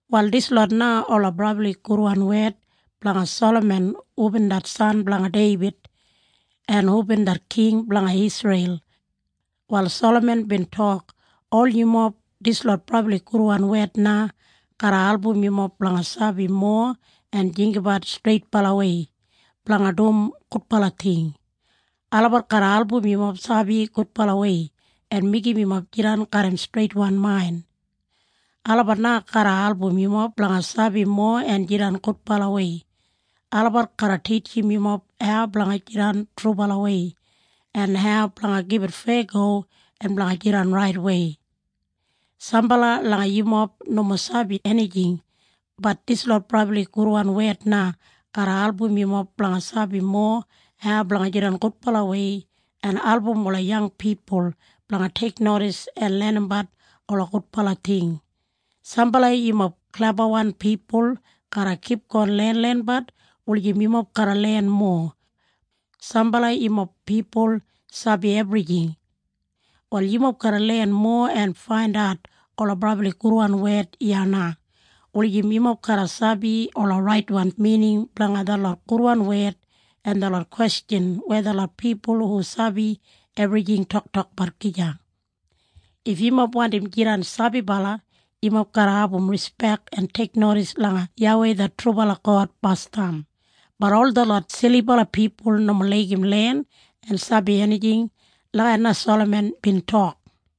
Wal dislot na ola brabli gudwan wed blanga Salaman hubin det san blanga Deibid, en hubin det king blanga Isreil. Wal Salaman bin tok, “Ol yumob, dislot brabli gudwan wed na garra album yumob blanga sabi mowa en jinggabat streitbalawei blanga dum gudbala ting. Olabat garra album yumob sabi gudbalawei en meigim yumob jidan garram streitwan main. Olabat na garra album yumob blanga sabi mowa en jidan gudbalawei. Olabat garra titjim yumob hau blanga jidan trubalawei, en hau blanga gibit feyago en blanga jidan raitwei. Sambala langa yumob nomo sabi enijing, bat dislot brabli gudwan wed na garra album yumob blanga sabi mowa hau blanga jidan gudbalawei en album ola yang pipul blanga teiknodis en lenimbat ola gudbala ting. Sambala yumob klebawan pipul garra kipgon lenlenbat, wulijim yumob garra len mowa. Sambala yumob pipul sabi ebrijing. Wal yumob garra len mowa en faindat ola brabli gudwan wed iya na, wulijim yumob garra sabi ola raitwan mining blanga detlot gudwan wed en detlot kwestjan weya detlot pipul hu sabi ebrijing toktokbat gija. “If yumob wandim jidan sabibala, yumob garra abum rispek en teiknodis langa YAWEI det trubala God basdam. Bat ol detlot silibala pipul nomo laigim len en sabi enijing.” Lagijat na Salaman bin tok.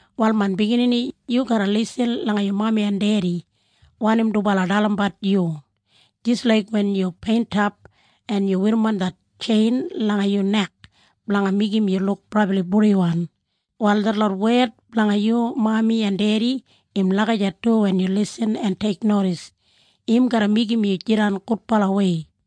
“Wal main biginini, yu garra lisin langa yu mami en dedi, wanim dubala dalimbat yu. Jis laik wen yu peintap en yu werrimon det tjein langa yu nek blanga meigim yu luk brabli purdiwan, wal detlot wed blanga yu mami en dedi im lagijat du wen yu lisin en teiknodis. Im garra meigim yu jidan gudbalawei.”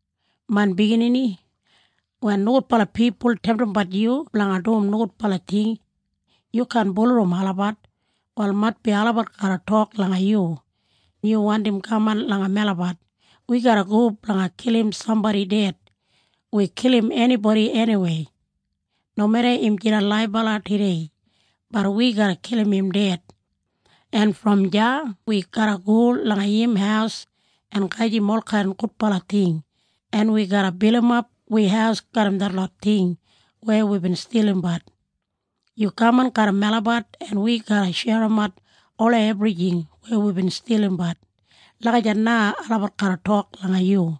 “Main biginini, wen nogudbala pipul temtimbat yu blanga dum nogudbala ting, yu kaan bulurrum olabat. Wal maitbi olabat garra tok langa yu, ‘Yu wandim kaman langa melabat? Wi garra go blanga kilim sambodi ded. Wi kilim enibodi eniwei. Nomeda im jidan laibala tudei, bat wi garra kilim im ded. En brom deya wi garra go langa im haus en gajim olkain gudbala ting en wi garra bilimap wi haus garram detlot ting weya wibin stilimbat. Yu kaman garram melabat en wi garra sherimat ola ebrijing weya wibin stilimbat.’ Lagijat na olabat garra tok langa yu.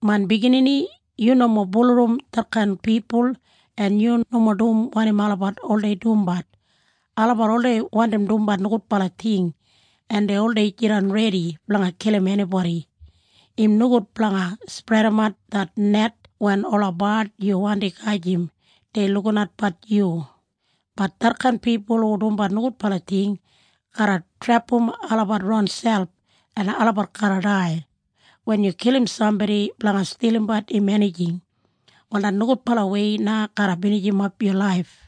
“Main biginini, yu nomo bulurrum detkain pipul en yu nomo dum wanim olabat oldei dumbat. Olabat oldei wandim dumbat nogudbala ting en dei oldei jidan redi blanga kilim enibodi. Im nogud blanga spredimat det net wen ola bard yu wandi gajim dei lukinatbat yu, bat detkain pipul hu dumbat nogudbala ting garra trepam olabat ronselp en olabat garra dai. Wen yu kilim sambodi blanga stilimbat im enijing, wal det nogudbalawei na garra binijimap yu laif.”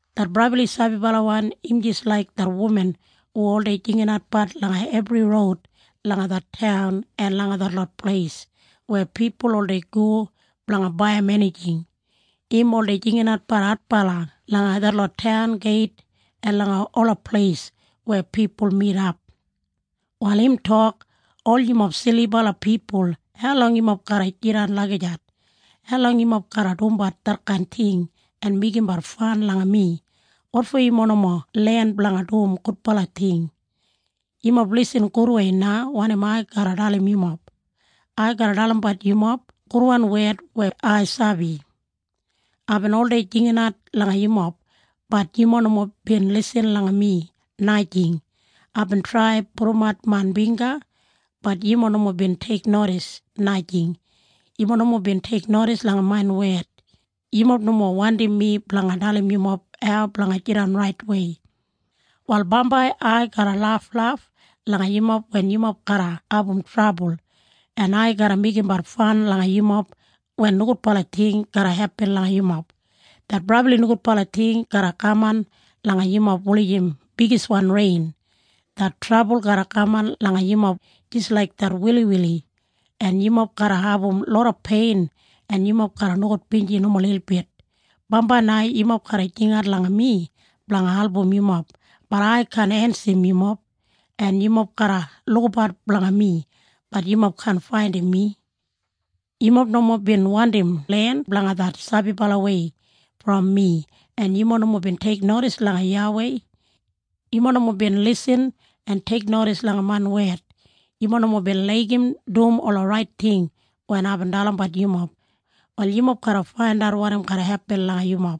Det brabli sabibalawan im jis laik det wuman hu oldei jinginatbat langa ebri roud langa det taun en langa detlot pleis weya pipul oldei go blanga baiyim enijing. Im oldei jinginatbat adbala langa detlot taun geit en langa ola pleis weya pipul midap. Wal im tok, “Ol yumob silibala pipul, haulong yumob garra jidan lagijat? Haulong yumob garra dumbat detkain ting en meigimbat fan langa mi? Wotfo yumob nomo len blanga dum gudbala ting? Yumob lisin gudwei na wanim ai garra dalim yumob. Ai garra dalimbat yumob gudwan wed weya ai sabi. Aibin oldei jinginat langa yumob, bat yumob nomo bin lisin langa mi, najing. Aibin trai pudumat main bingga, bat yumob nomo bin teiknodis, najing. Yumob nomo bin teiknodis langa main wed. Yumob nomo wandim mi blanga dalim yumob hau blanga jidan raitwei. “Wal bambai ai garra laflaf langa yumob wen yumob garra abum trabul, en ai garra meigimbat fan langa yumob wen nogudbala ting garra hepin langa yumob. Det brabli nogudbala ting garra kaman langa yumob wulijim bigiswan rein. Det trabul garra kaman langa yumob jis laik det wiliwili, en yumob garra abum loda pein en yumob garra nogudbinji nomo lilbit. Bambai na yumob garra jingat langa mi blanga album yumob, bat ai kaan ensim yumob. En yumob garra lukabat blanga mi, bat yumob kaan faindim mi. Yumob nomo bin wandim len blanga det sabibalawei brom mi en yumob nomo bin teiknodis langa YAWEI. Yumob nomo bin lisin en teiknodis langa main wed. Yumob nomo bin laigim dum ola rait ting wen aibin dalimbat yumob. Wal yumob garra faindat wanim garra hepin langa yumob.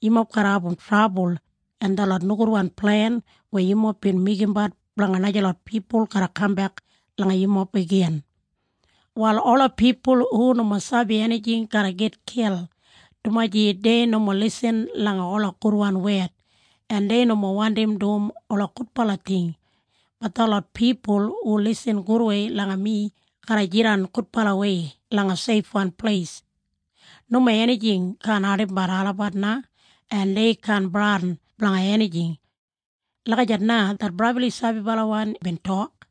Yumob garra abum trabul. En detlot nogudwan plen weya yumob bin meigimbat blanga najalot pipul garra kambek langa yumob igin. “Wal ola pipul hu nomo sabi enijing garra gitkil, dumaji dei nomo lisin langa ola gudwan wed en dei nomo wandim dum ola gudbala ting. Bat detlot pipul hu lisin gudwei langa mi garra jidan gudbalawei langa seifwan pleis. Nomo enijing kaan ardimbat olabat na en dei kaan bradin blanga enijing.” Lagijat na det brabli sabibalawan bin tok.